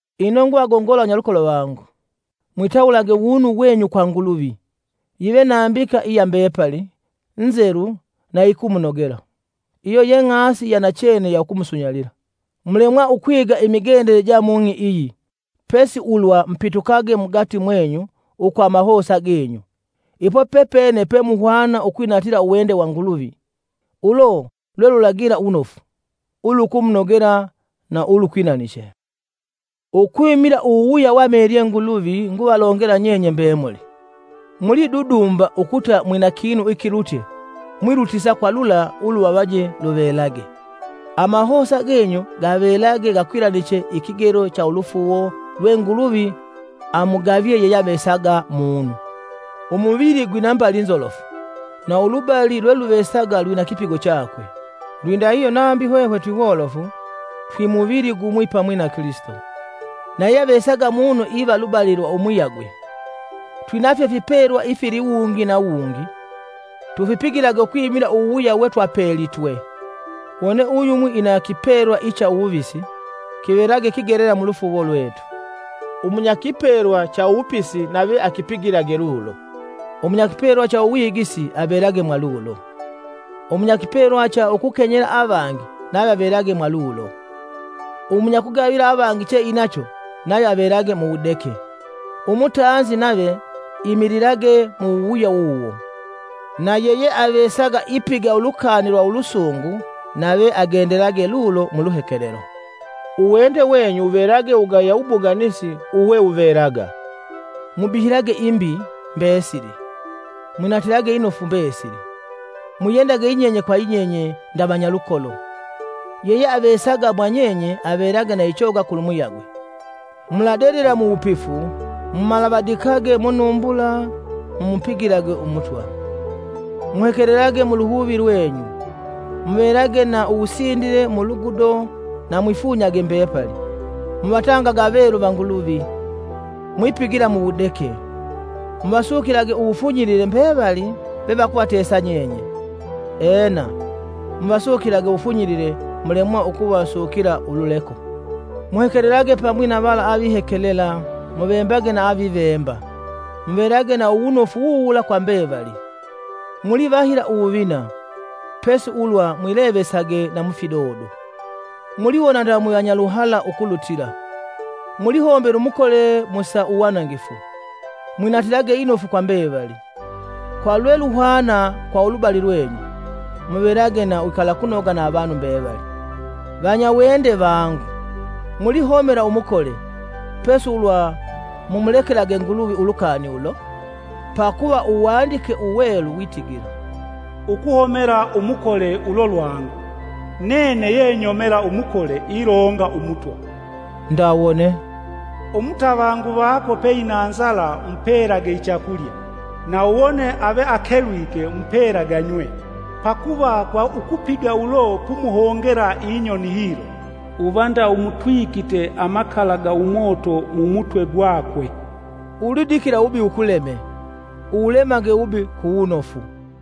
Ino nguvagongola vanyalukolo vangu, mwitawulage uwunu wenyu kwa Nguluvi, yive nambika iya mbepali, nzelu na iyikumunogela. Iyo ye ng'asi iyanachene ya ukumusunyalila. Mulemwa ukwiga imigendele ja mung'i iyi, pesi ulwa mupitukage mugati mwenyu ukwa amahosa genyu. Ipo pepene pe muhwana ukwinatila uwende wa Nguluvi, ulo lwelulagila wunofu, ulukumunogela na ulukwilaniche. Ukwimila uwuwuya weamelye Nguluvi nguvalongela nyenye mbemuli: mulidudumba ukuta mwina kinu ikilutye mwilutisa kwa lula uluvavaje luvelage. Amahosa genyu gavelage gakwilaniche ikigelo cha ulufuuwo lwe Nguluvi amugavye yeyeavesaga mumu. Umuvili gwina mbali nzolofu, na ulubali lweluvesaga lwina kipigo chakwe. Lwindahihyo nambi hwehwe twiwolofu, twimuvili gumwi pamwi na Kilisito, na yeyeavesaga munu iva lubali lwa umuyagwe. Twinafyo ifipelwa ifiliwungi na wungi tufipigilage ukwimila uwuwuya wetwapelitwe; wone uyumwi ina kipelwa icha uwuvisi kivelage kigelela mulufuuwo lwetu. Umunyakipelwa cha uwupisi nave akipigilage lulo. Uwunyakipelwa cha uwigisi avelage mwa lulo. Umunyakipelwa cha ukukenyela avangi nave avelage mwa lulo. Umunyakugavila avangi che inacho nave avelage mu wudeke. Umutanzi nave Imililage mu wuwuya wuwo; na yeyeavesaga ipiga ulukani lwa ulusungu nave agendelage lulo muluhekelelo. Uwende wenyu wuvelage wugaya wubuganisi uwewuvelaga. Mubihilage imbi mbesili, mwinatilage inofu mbesili. Mwiyendage yinyenye kwa yinyenye nda vanyalukolo; yeyeavesaga mwa nyenye avelage na ichoga kulumuyagwe. Muladedela mu wupifu, mumalavadikage munumbula mu mupigilage Umutwa. Muhekelelage muluhuvi lwenyu: muvelage na uwusindile mulugudo na mwifunyage mbepali. Muvatangage avelu va Nguluvi, mwipigila muwudeke. Muvasukilage uwufunyilile mbevali vevakuvatesa nyenye; ena, muvasukilage uwufunyilile mulemwa ukuvasukila ululeko. Muhekelelage pamwi na vala avihekelela muvembage na avivemba. Muvelage na uwunofu wuwula kwa mbevali. Mulivahila uwuvina, pesi ulwa mwilevesage na mufidodo. Muliwona nda mwivanyaluhala ukulutila. Mulihombela umukole mu sa uwanangifu. Mwinatilage inofu kwa mbevali. Kwa lwe luhwana kwa ulubali lwenyu, muvelage na uwikalakunoga na avanu mbevali. Vanyawende vangu, mulihomela umukole, pesi ulwa mumulekelage Nguluvi ulukani ulo; pakuva Uwandike Uwelu witigila, “Ukuhomela umukole ulo lwangu; nene ye nyomela umukole ilonga Umutwa.” Nda wone, “Umutavangu vako peina nzala; mupelage ichakulya; na wone ave akelwike; mupelage anywe. Pakuva kwa ukupiga ulo pumuhongela inyoni hilo, uva nda umutwikite amakala ga umoto mu mutwe gwakwe.” Ulidikila uwubi wukuleme, uwulemage uwubi ku wunofu.